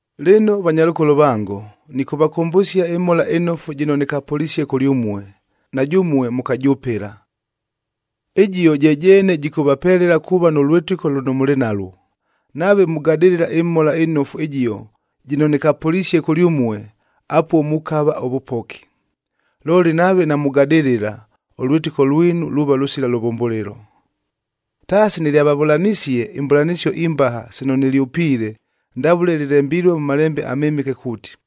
Lɨno vanyalʉkolo vango, nɨkʉvakʉmbʉsia ɨMhola ɨNofu jɨno nɨkapʉlisie kʉlyʉmue, na jʉmue mʉkajʉpɨla. Ɨjio je jeene jɨkʉvapelela kuuva nʉ lwɨtɨko lʉno mʉlɨ nalwo. Nave mugadɨlɨla ɨMhola ɨNofu ɨjio jɨno nɨkapʉlisie kʉlyʉmue, apuo mukava ʉvʉpoki. Looli nave namugadɨlɨla, ʉlwɨtɨko lwinu luuva lʉsila lʉvʉmbʉlɨlo. Taasi nɨlyavavʉlanisie imbʉlanɨsio imbaha sino nɨlyʉpiile, ndavʉle lɨlembilue mʉ Malembe aMɨmɨke kuuti,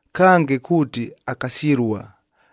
Kange kuuti akasyɨlua,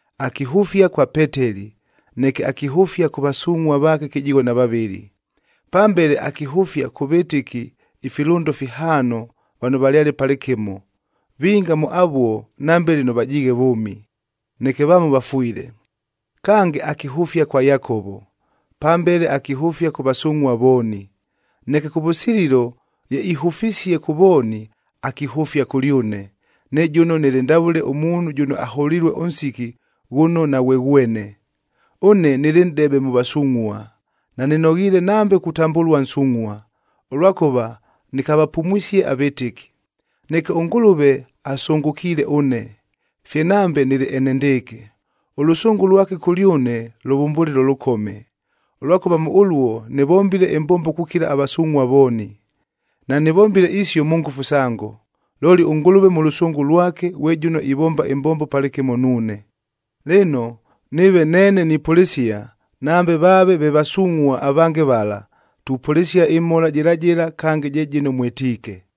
Akihʉfia kwa Peteli,c neke akihʉfia kʉ vasungʼhua vaake kɨjigho na vavɨlɨ. Pambele akihʉfia kʉ vɨtɨki ifilʉndo fihaano vano valyale palɨkɨmo, vinga mʉ avuo nambe lɨno vajiighe vʉʉmi, neke vamo vafwile. Kange, akihʉfia kwa Yakovo, pambele akihʉfia kʉ vasungʼhua vooni. Neke kʉvʉsililo ye ihʉfisie kʉ vooni, akihʉfia kʉlyʉne, ne jʉno nɨlɨ ndavʉle ʉmuunhu jʉno aholilue ʉnsiki ghʉno naghweghwene. Ʉne nɨlɨ nʼdebe mʉ vasungʼhua,d nanɨnoghiile nambe kutambʉlua nsungʼhua, ʉlwakʉva nɨkavapumwisie avɨtɨki. Neke ʉNgʉlʉve asʉngʉkiile ʉne, fye nambe nɨlɨ enendɨɨkɨ. Ʉlʉsʉngʉ lwake kʉlyʉne lʉvʉmbʉlɨlo lʉkome, ʉlwakʉva mʉ ʉluo nɨvombile ɨmbombo kukila avasungʼhua vooni. Nanɨvombile isio mʉ ngʉfu sango, looli ʉNgʉlʉve mʉ lʉsʉngʉ lwake ghwe jʉno ivomba ɨmbombo palɨkɨmo nuune. Lɨno, nɨɨve neene nipʉlɨsia, nambe vaave ve vasungʼhua avange vala, tupʉlɨsia ɨmhola jɨla jɨla, kange je jɨno mwɨtiike.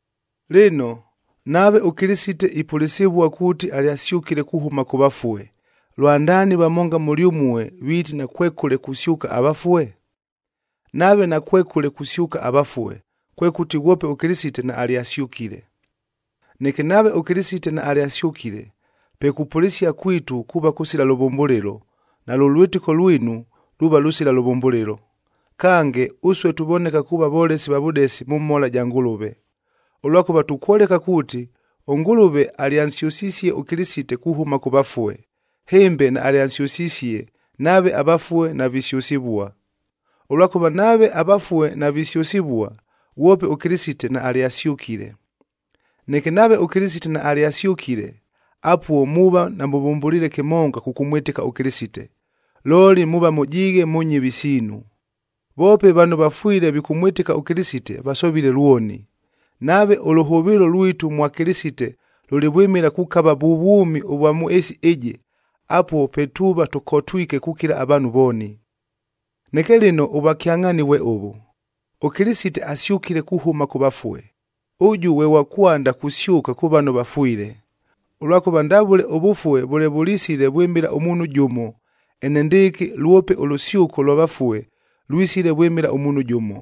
Lɨno, nave ʉKɨlɨsite ipʉlɨsɨvua kuuti alyasyʉkile kuhʉma kʉ vafue, lwandaani vamonga mʉlyʉmue viiti nakwekʉle kusyʉka avafue? Nave nakwekʉle kusyʉka avafue, kwekʉti ghwope ʉKɨlɨsite naalyasyʉkile. Neke nave ʉKɨlɨsite naalyasyʉkile, pe kupʉlɨsia kwitu kuuva kʉsila lʉvʉmbʉlɨlo, nalʉ lwɨtɨko lwinu luuva lʉsila lʉvʉmbʉlɨlo. Kange, ʉsue tuvoneka kuuva volesi va vʉdesi mʉ mhola ja Ngʉlʉve. Ʉlwakʉva tukwoleka kuuti, ʉNgʉlʉve alyansyʉsisie ʉKɨlɨsite kuhʉma kʉ vafue, hɨmbe naalyansyʉsisie nave avafue navisyʉsɨvua. Ʉlwakʉva nave avafue navisyʉsɨvua, ghwope ʉKɨlɨsite naalyasyʉkile. Neke nave ʉKɨlɨsite naalyasyʉkile, apuo muuva namʉvʉmbʉliile kɨmonga kʉkʉmwɨtɨka ʉKɨlɨsite, looli muuva mʉjiighe mʉ nyɨvi siinu. Voope vano vafwile vikʉmwɨtɨka ʉKɨlɨsite, vasovile lwoni. Nave ʉlʉhʉvɨɨlo lwitu mwa Kɨlɨsite lʉlɨ vwɨmɨla kukava vʉ vwʉmi ʉvwa mʉ ɨɨsi ɨjɨ, apuo pe tuuva tʉkotwike kukila avaanhu vooni. Neke lɨno ʉvwakyangʼhaani vwe ʉvʉ, ʉKɨlɨsite asyʉkile kuhʉma kʉ vafue, ʉjʉ ghwe ghwa kwanda kusyʉka kʉ vano vafwile. Ʉlwakʉva ndavʉle ʉvʉfue vʉle vʉlisile vwɨmɨla ʉmuunhu jʉmo, enendɨɨkɨ lwope ʉlʉsyʉko lwa vafue lwisile vwɨmɨla ʉmuunhu jʉmo.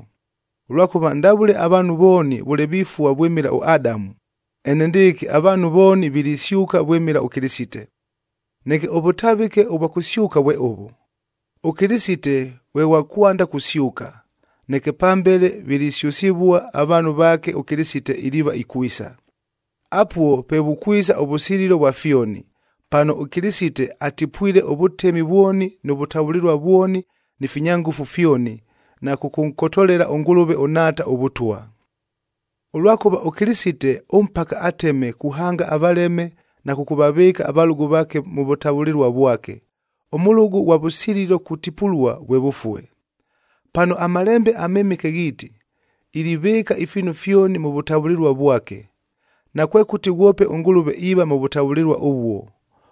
Ʉlwakʉva ndavʉle avaanhu vooni vʉle vifua vwɨmɨla ʉAdamu, enendɨɨkɨ avaanhu vooni vilisyʉka vwɨmɨla ʉKɨlɨsite. Neke ʉvʉtavɨke ʉvwa kʉsyʉka vwe ʉvʉ: ɄKɨlɨsite ghwe ghwa kwanda kusyʉka, neke pambele vilisyʉsɨvua avaanhu vaake ʉKɨlɨsite iliiva ikwisa. Apuo pe vukwisa ʉvʉsililo vwa fyoni, pano ʉKɨlɨsite atipwile ʉvʉtemi vwoni nʉ vʉtavʉlɨlua vwoni ni finya ngʉfu fyoni, na kʉkʉnkotolela ʉNgʉlʉve ʉNhaata ʉVʉtwa. Ʉlwakʉva ʉKɨlɨsite ʉmpaka ateme kuhanga avaleme na kʉkʉvavɨɨka avalʉgʉ vaake mʉ vʉtavʉlɨlua vwake,ef ʉmʉlʉgʉ ʉghwa vʉsililo kutipulua vwe vʉfue. Pano aMalembe aMɨmɨke ghiiti, “Ilivɨɨka ifiinu fyoni mʉ vʉtavʉlɨlua vwake.” Nakwekʉti ghwope ʉNgʉlʉve iiva mʉ vʉtavʉlɨlua ʉvuo,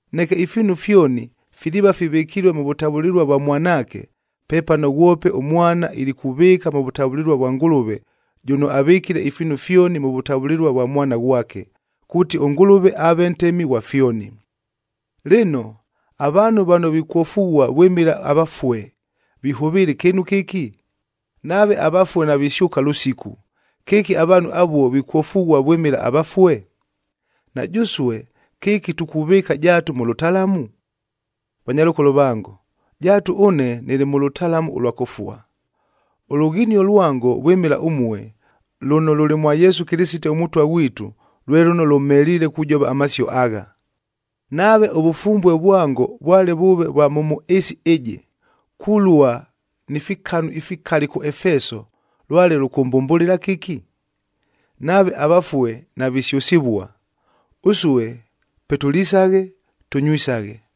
Neke ifiinu fyoni filiiva fivɨkilue mʉ vʉtavʉlɨlua vwa Mwanaake,h pepano ghwope ʉMwana ilikuvɨɨka mʉ vʉtavʉlɨlua vwa Ngʉlʉve jʉno avɨkile ifiinu fyoni mʉ vʉtavʉlɨlua vwa Mwana ghwake, kuuti ʉNgʉlʉve aave Ntemi ghwa fyoni. Lɨno, avaanhu vano vikwofughua vwɨmɨla avafue vihʉvɨɨla ɨkɨɨnu kɨki? Nave avafue navisyʉka lʉsiku, kɨki avaanhu avuo vikwofughua vwɨmɨla avafue? Na jʉsue kɨki tukuvɨɨka jaatu mʉ lʉtalamu? Vanyalʉkolo vango, jaatu ʉne nɨlɨ mʉ lʉtalamu ʉlwa kʉfua. Ʉlʉghinio lwango vwɨmɨla ʉmue, lʉno lʉlɨ mwa Yesu Kɨlɨsite ʉMʉtwa ghwitu, lwe lʉno lʉmheliile kujova amasio agha. Nave ʉvʉfumbue vwango vwale vʉʉve vwa mʉ mʉ ɨɨsi ɨjɨ, kulua ni fikanu ifikali kʉ Efeso lwale lʉkʉmbʉmbʉlɨla kɨki? Nave avafue navisyʉsɨvua, “Ʉsue pe tʉlisaghe, tʉnywisaghe,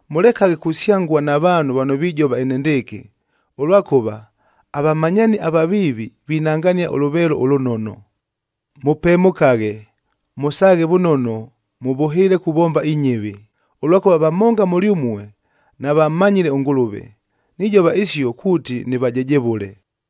Mʉlekaghe kusyangua na vaanhu vano vijova enendɨɨkɨ, ʉlwakʉva, “Avamanyaani avaviivi, vinangania ʉlʉveelo ʉlʉnono.” Mʉpemʉkaghe, mʉsaaghe vʉnono mʉvʉhɨɨle kuvomba inyɨvi, ʉlwakʉva vamonga mʉlyʉmue navammanyile ʉNgʉlʉve. Nijova isio kuuti nɨvajejevʉle.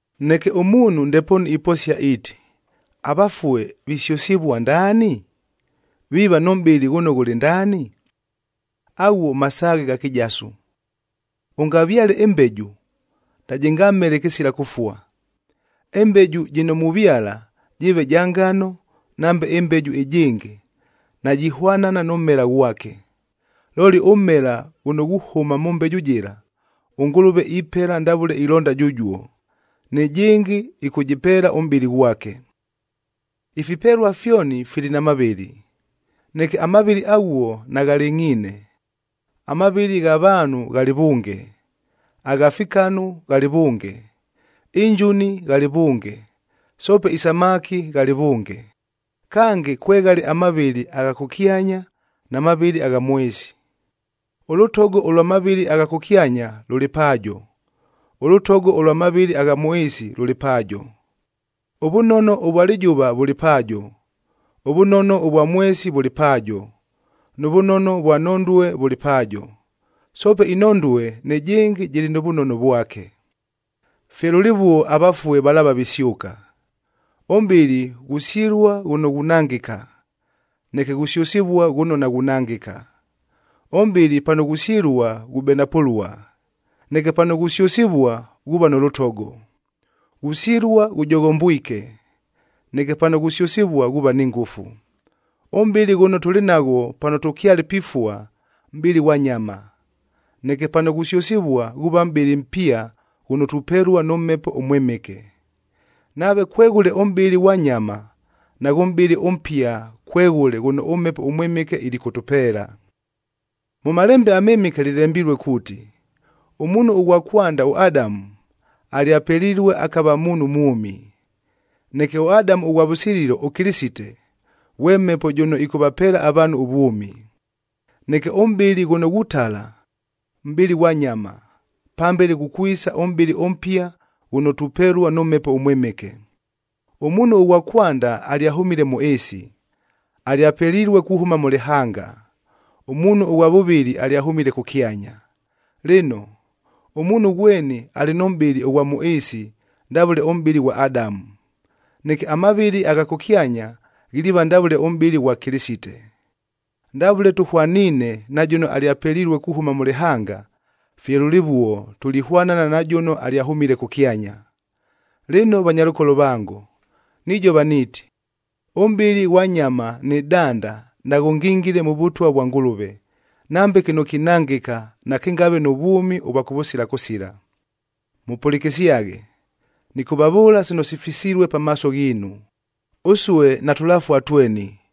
Neke ʉmuunhu ndepoonu iposia iiti, “Avafue visyʉsɨvua ndaani? Viiva nʉ mʼbɨlɨ ghʉno ghʉlɨ ndaani?” Aghuo masaaghe gha kɨjasu! Ʉngavyale ɨmbeju, najɨngamele kɨsila kʉfua. Ɨmbeju jɨno muvyala, jɨɨve ja ngano nambe ɨmbeju ɨjɨngɨ, najihwanana nʉ mmela ghwake. Looli ʉmmela ghʉno ghuhʉma mʉ mbeju jɨla, ʉNgʉlʉve ipela ndavʉle ilonda jʉjuo, nɨjɨngɨ ɨkʉjɨpeela ʉmʼbɨlɨ ghwake. Ifipelua fyoni fili na mavɨlɨ, neke amavɨlɨ aghuo naghalɨngʼhiine, amavɨlɨ gha vaanhu ghalɨ vʉnge, agha fikanu ghalɨ vʉnge, injuni ghalɨ vʉnge, soope isamaki ghalɨ vʉnge. Kange, kweghale amavɨlɨ agha kʉkyanya na mavɨlɨ agha mʉ ɨɨsi. Ʉlʉtogo ʉlwa mavɨlɨ agha kʉkyanya lʉlɨ paajo, ʉlʉtogo ʉlwa mavɨlɨ agha mʉ ɨɨsi lʉlɨ paajo. Ʉvʉnono ʉvwa lɨjʉva vʉlɨ paajo, ʉvʉnono ʉvwa mwesi vʉlɨ paajo nʉ vʉnono ʉvwa nhondue vʉlɨ paajo. Soope inhondue nɨjɨngɨ jɨlɨ nʉ vʉnono vwake. Fye lʉlɨvuo avafue valaava visyʉka. Ʉmʼbɨlɨ ghusyɨlua ghʉno ghunangɨka, neke ghusyʉsɨvua ghʉno naghunangɨka; ʉmʼbɨlɨ pano ghusyɨlua ghubenapʉlua, neke pano ghusyʉsɨvua ghuuva nʉ lʉtogo. Ghusyɨlua ghʉjoghombwike, neke pano ghusyʉsɨvua ghuuva ni ngʉfu. Ʉmʼbɨlɨ ghʉno tʉlɨ naghwo pano tʉkyale pifua, mʼbɨlɨ ghwa nyama, neke pano ghusyʉsɨvua ghuuva mʼbɨlɨ mpia ghʉno tupelua nʉ Mhepo ʉMwɨmɨke. Nave kweghʉle ʉmʼbɨlɨ ghwa nyama, naghʉ mʼbɨlɨ ʉmpia kweghʉle ghʉno ʉMhepo ʉMwɨmɨke ilikʉtʉpeela. Mʉ Malembe aMɨmɨke lɨlembilue kuuti, “Ʉmuunhu ʉghwa kwanda ʉAdamu, alyapelilue akava muunhu mwʉmi,”j neke ʉAdamu ʉghwa vʉsililo ʉKɨlɨsite, ghwe Mhepo jʉno ɨkʉvapeela avaanhu ʉvwʉmi. Neke ʉmʼbɨlɨ ghʉno ghutala, mʼbɨlɨ ghwa nyama, pambele ghukwisa ʉmʼbɨlɨ ʉmpia ghʉno tupelua nʉ Mhepo ʉMwɨmɨke. Ʉmuunhu ʉghwa kwanda alyahʉmile mʉ ɨɨsi, alyapelilue kuhʉma mʉ lɨhanga. Ʉmuunhu ʉghwa vʉvɨlɨ alyahʉmile kʉkyanya. Lɨno, ʉmuunhu ghweni alɨ nʉ mʼbɨlɨ ʉghwa mʉ ɨɨsi ndavʉle ʉmʼbɨlɨ ghwa Adamu, neke amavɨlɨ agha kʉkyanya ghiliiva ndavʉle ʉmʼbɨlɨ ʉghwa Kɨlɨsite. Ndavʉle tʉhwaniine na jʉno alyapelilue kuhʉma mʉ lɨhanga, fye lʉlɨvuo tulihwanana na jʉno alyahʉmile kʉkyanya. Lɨno vanyalʉkolo vango, nijova niiti, ʉmʼbɨlɨ ʉghwa nyama nɨ danda naghʉngingile mʉ Vʉtwa vwa Ngʉlʉve, nambe kɨno kinangɨka nakɨngave nʉ vwʉmi ʉvwa kʉvʉsila kʉsila. Mʉpʉlɨkɨsyaghe, nɨkʉvavʉʉla sino sifisilue pamaaso ghiinu. Ʉsue natʉlafua tweni,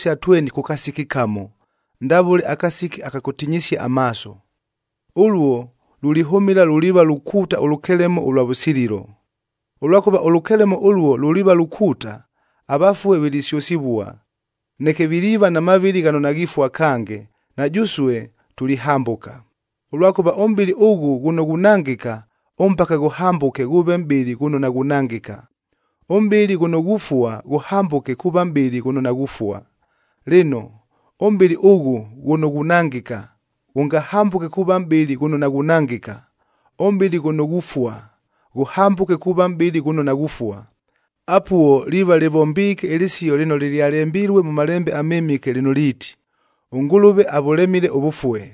kʉ kasiki kamo, ndavʉle akasiki aka kʉtinyisia amaaso. Ʉluo lulihʉmɨla luliiva lukuuta ʉlʉkelemo ʉlwa vʉsililo. Ʉlwakʉva ʉlʉkelemo ʉluo luliiva lukuuta, avafue vilisyʉsɨvua, neke viliiva na mavɨlɨ ghano naghifua kange na jʉsue tulihambʉka. Ʉlwakʉva ʉmʼbɨlɨ ʉghʉ ghʉno ghunangɨka ʉmpaka ghʉhambʉke ghʉʉve mʼbɨlɨ ghʉno naghunangɨka, ʉmʼbɨlɨ ghʉno ghufua ghʉhambʉke kuuva mʼbɨlɨ ghʉno naghufua. Lɨno, ʉmʼbɨlɨ ʉghʉ ghʉno ghunangɨka, ghʉngahambʉke kuuva mʼbɨlɨ ghʉno naghunangɨka; ʉmʼbɨlɨ ghʉno ghufua, ghʉhambʉke kuuva mʼbɨlɨ ghʉno naghufua, apuo liiva lɨvombiike ɨlɨsio lɨno lɨlyalembilue mʉ Malembe aMɨmɨke lɨno liiti, “ɄNgʉlʉve avʉlemile ʉvʉfue,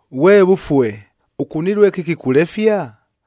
“Ghwe vʉfue, ʉkunilue kɨki kulefia?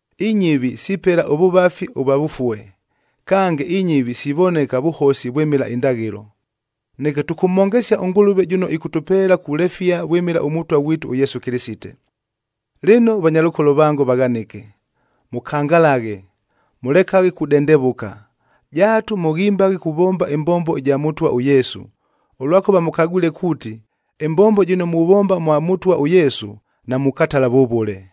Inyɨvi sipela ʉvʉvafi ʉvwa vʉfue, kange, inyɨvi sivoneka vʉhosi vwɨmɨla indaghɨlo. Neke tʉmhongesyaghe ʉNgʉlʉve jʉno ɨkʉtʉpeela kulefia vwɨmɨla ʉMʉtwa ghwitu ʉYesu Kɨlɨsite. Lɨno vanyalʉkolo vango vaghanɨke, mʉkangalaghe, mʉlekaghe kudendevʉka, jaatu mʉghimbaghe kuvomba ɨmbombo ɨja Mʉtwa ʉYesu, ʉlwakʉva mʉkagwile kuuti, ɨmbombo jɨno muvomba mwa Mʉtwa ʉYesu, namukatala vʉvʉle.